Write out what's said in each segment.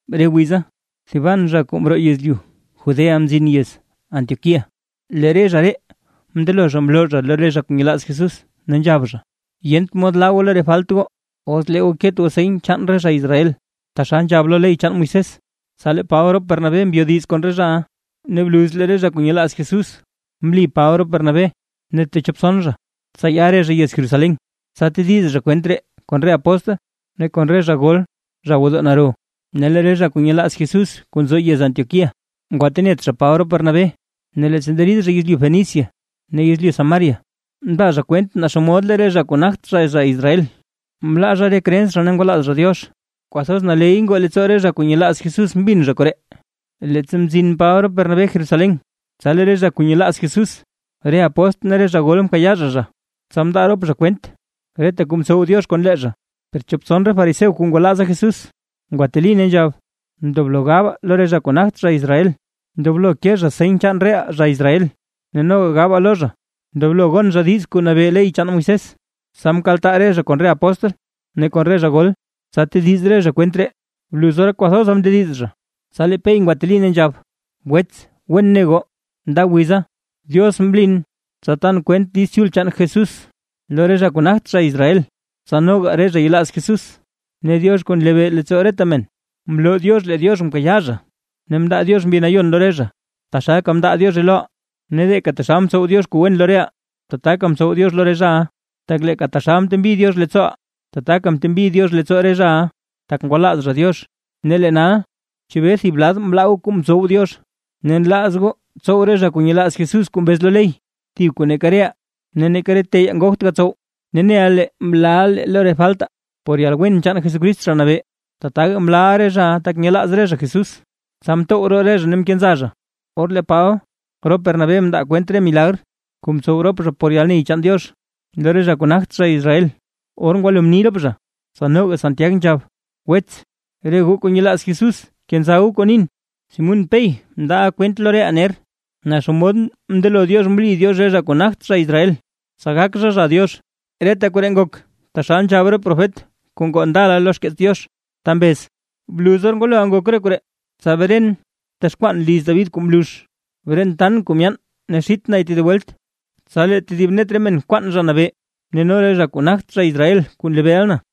Re wiza, thiban zha kuu mroo yezlyu Judea mzin yez Antioquía, lee re zha ree mndelo mloo lo re zha kuu nyelaaz Jesús, ne nzhab zha: ―Yent mod laa goo lo re falt goo, os lee goo ket goo seny chaan re zha Israel, taxal nzhab lo ley chaan Moisés. Tsa lee Paba rop Bernabé mbyodiz kon re zhaʼa, ne bluz lee re zha kuu nyelaaz Jesús mli Paba rop Bernabé, ne techop tson zha tsa ya re zha yez Jerusalén, tsa tediz zha kwent ree kon re apóstl ne kon re zha gol zha gwodoo naro. Ne lee re zha kuu nyelaaz Jesús kuu nzo yez Antioquía, ngwatenet zha Paba rop Bernabé, ne leettsa nderid zha yezlyu Fenicia ne yezlyu Samaria, mndaa zha kwent naa xomod lee re zha kuu nagt zha Israel, mlaaʼa zha re creens zha ne ngwalaaz zha Diox. Ne kwathoz naley ngoo leettsoo re zha kuu nyelaaz Jesús mbin zha koree. Leettsa mzin Paba rop Bernabé Jerusalén, tsa lee re zha kuu nyelaaz Jesús, re apóstl ne re zha gol mkayaa zha zha. Tsa mndaa rop zha kwent reta kuu mtsow Diox kon lee zha. Per chop tson re fariseo kuu ngwalaaza Jesús ngwateli ne nzhab: ―Ndoblo gabaa lo re zha kuu nagt zha Israel, ndoblo ke zha seny chaan reʼaa zha Israel, ne noga gabaa lo zha ndoblo gon zha diiz kuu nabee lo ley chaan Moisés. Tsa mkaltaa re zha kon re apóstl ne kon re zha gol, tsa tediz re zha kwent ree. Bluz or kwathoza mndediz zha, tsa lee Pey ngwateli ne nzhab: ―Wets wen ne goo, nda wiza, Diox mlin tsa tan kwent Diiz Chul chaan Jesús lo re zha kuu nagt zha Israel, tsa noga re zha yelaaz Jesús. Ne Diox kuu nlebee leettsoo reta men, mloo Diox lee Diox mkayaa zha, ne mndaa Diox Mbi Nayon lo re zha, taxalka mndaa Diozhe loʼaa. Ne leeka taxal mtsow Diox kuu wen lo reʼaa, tataka mtsow Diox lo re zhaʼa, tak leeka taxal mtembi Diox leettsooʼaa, tataka mtembi Diox leettsoo re zhaʼa, tak ngwalaaz zha Diox. Ne lee nal; ¿chebee thib lad nlaa goo kuu mtsow Diox, ne nlaaz goo tsow re zha kuu nyelaaz Jesús kuu mbez lo ley, thib kuu neeka reʼaa ne neeka re teyaa ngogt gatsow? Ne neʼa lee mlaaʼa lee lo re faltaa, por yalwen chaan Jesucrist Zha Nabee, tataga mlaaʼa re zhaʼa tak nyelaaz re zha Jesús. Tsa mtow roo re zha ne mkenza zha, or lee Paba rop Bernabé mndaa kwent re milagr kuu mtsow rop zha por yalney chaan Diox lo re zha kuu nagt zha Israel. Or ngwalo mni rop zha, tsa noga Santiag nzhab: ―Wets, re goo kuu nyelaaz Jesús kenza goo kuu nin: Simún Pey mndaaʼa kwent lo reʼaa ner, naa xomod mndelo Diox mli Diox re zha kuu nagt zha Israel, tsa gak zha zha Diox. Reta koree ngok taxal nzhab re profet kuu ngoo ndala lo xkeets Diox ta mbez: Bluz or ngwaloʼa ngok re koree, tsa bren texkwaan liz David kuu mlux. Bren tan kuu myaan ne xit nay tedib welt, tsa lee tedib net re men kwaan Zha Nabee, ne no re zha kuu nagt zha Israel kuu nlebeeʼa na.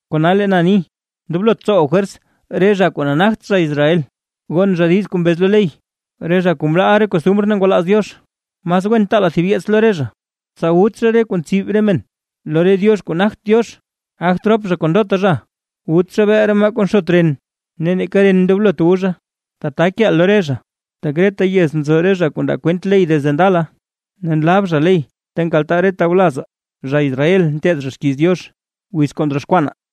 ’Kona lee na ni: Ndoblot tsowaa fwers re zha kuu nagt zha Israel gon zha diiz kuu mbez lo ley, re zha kuu mlaaʼa re costumr ne ngwalaaz Diox. Mas wen taalaa thib yeets lo re zha, tsa wut zha re kuu ntsib re men lo re diox kuu nagt Diox, gagt rop zha kon ndota zha, wut zha beel re maa kuu nxot ren ne neeka ren ndoblot wu zha. Tata keeʼaa lo re zha, tak reta yez nzo re zha kuu ndaa kwent ley desde ndala, ne nlab zha ley ta nkaltaa re tawlazaa zha Israel nteed xkiiz Diox, wiz kuu ndroxkwanaa.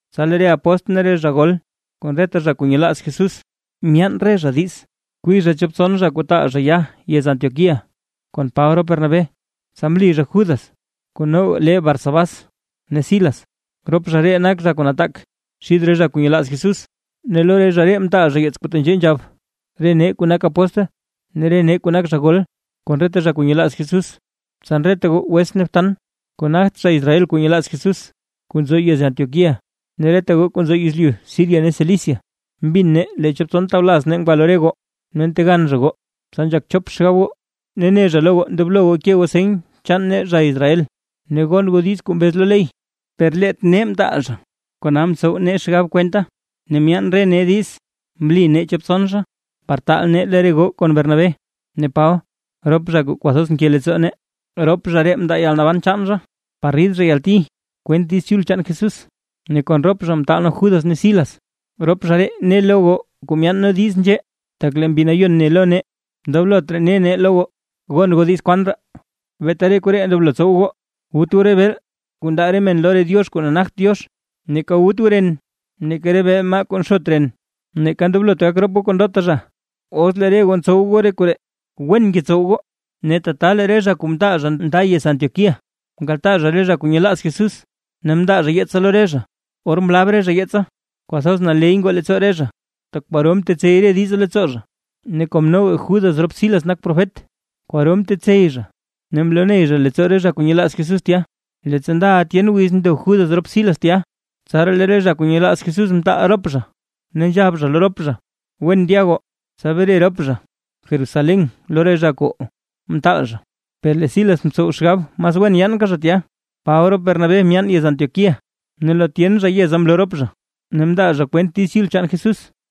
Tsa lee re apóstl ne re zha gol, kon reta zha kuu nyelaaz Jesús, myaan re zha diiz kwii zha chop tson zha kuu taal zha ya yez Antioquía kon Paba rop Bernabé. Tsa mli zha Judas kuu noga lee Barsabás ne Silas, rop zha ree nak zha kuu nataak xid re zha kuu nyelaaz Jesús, ne lo re zha ree mtaal zha yeets kuu tenzhee nzhab: “Re nee kuu nak apóstl ne re nee kuu nak zha gol kon reta zha kuu nyelaaz Jesús. Tsan reta goo wets ne btan, kuu nagt zha Israel kuu nyelaaz Jesús kuu nzo yez Antioquía, ne reta goo kuu nzo yezlyu Siria ne Cilicia. Mbin nee lee chop tson tawlaz nee ngwa lo re goo ne ntegan zha goo, tsa nzhak chop xgab goo, ne ne zha lo goo ndoblo goo ke goo seny chaan nee zha Israel, ne gon goo diiz kuu mbez lo ley, per leet nee mtaal zha. Kona mtsow nee xgab kwenta ne myaan re nee diiz mli nee chop tson zha, par taal nee lo re goo kon Bernabé ne Paba rop zha kuu kwathoz nke leettsoo nee. Rop zha ree mndaa zha yalnaban chaan par rid zha yalti kwent Diiz Chul chaan Jesús. Ne kon rop zha mtaal nee Judas ne Silas, rop zha ree ne lo goo kuu myaan nee diiz nzhee. Tak lee Mbi Nayon ne lo nee, ndoblot raa ne nee lo goo gon goo diiz kwan raa, beeta re koree ndoblo tsow goo: Wut goo re beel kuu ndaa re men lo re diox kuu nagt Diox, neeka wut goo ren neeka re beel maa kuu nxot ren, ne ndoblot gak rop goo kon ndota zha. Os lee re goo ntsow goo re koree, wen ngetsow goo.” Ne tata lee re zha kuu mtaal zha nda yez Antioquía, mkaltaa zha re zha kuu nyelaaz Jesús, ne mndaa zha yeetsa lo re zha. Or mlab re zha yeetsa, kwathoz naley ngoo leettsoo re zha, tak kwaro mtetsey re diza leettsoo zha. Ne kom noga Judas rop Silas nak profet, kwaro mtetsey zha ne mloney rop zha ree leettsoo re zha kuu nyelaaz Jesús tya. Leettsa ndaʼa tyen wiz ndo Judas rop Silas tya, tsaraa lee re zha kuu nyelaaz Jesús mtaal zha rop zha, ne nzhab zha lo rop zha “Wen ndya goo”, tsa bre rop zha Jerusalén lo re zha kuu mtaal zha. Per lee Silas mtsow xgab mas wen yaanka zha tya. Paba rop Bernabé myaan yez Antioquía, ne lo tyen zha yeza mloo rop zha ne mndaa zha kwent Diiz Chul chaan Jesús.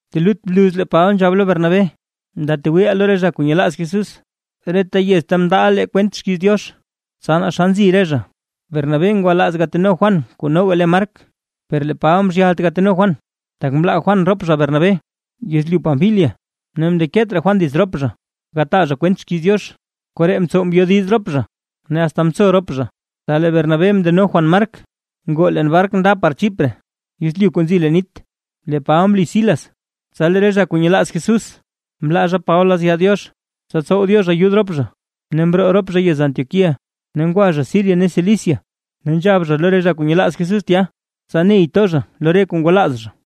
Telut bluz lee Paba nzhab lo Bernabé: ―Ndatwiiʼaa lo re zha kuu nyelaaz Jesús, reta yez ta mndaaʼa lee kwent xkiiz Diox, tsa naa xa nzi re zha. Bernabé ngwalaaz gateno Juan kuu noga le Mark, per lee Paba mzhyalt gateno Juan, tak mlaa Juan Paba rop Bernabé yezlyu Panfilia ne mndeket raa Juan dits rop zha gataa zha kwent xkiiz Diox. Koree mtsow mbyodiz rop zha, ne asta mtso rop zha; tsa lee Bernabé mndeno Juan Mark, ngoo leen bark nda par Chipre yezlyu kuu nzi leen nit. Lee Paba mli Silas, tsa lee re zha kuu nyelaaz Jesús mlaa zha Paba lazya Diox, tsa tsow Diox ayud rop zha, ne mroo rop zha yez Antioquía. Ne ngwa zha Siria ne Cilicia ne nzhab zha lo re zha kuu nyelaaz Jesús tya, tsa ney to re zha lo kuu ngwalaaz zha.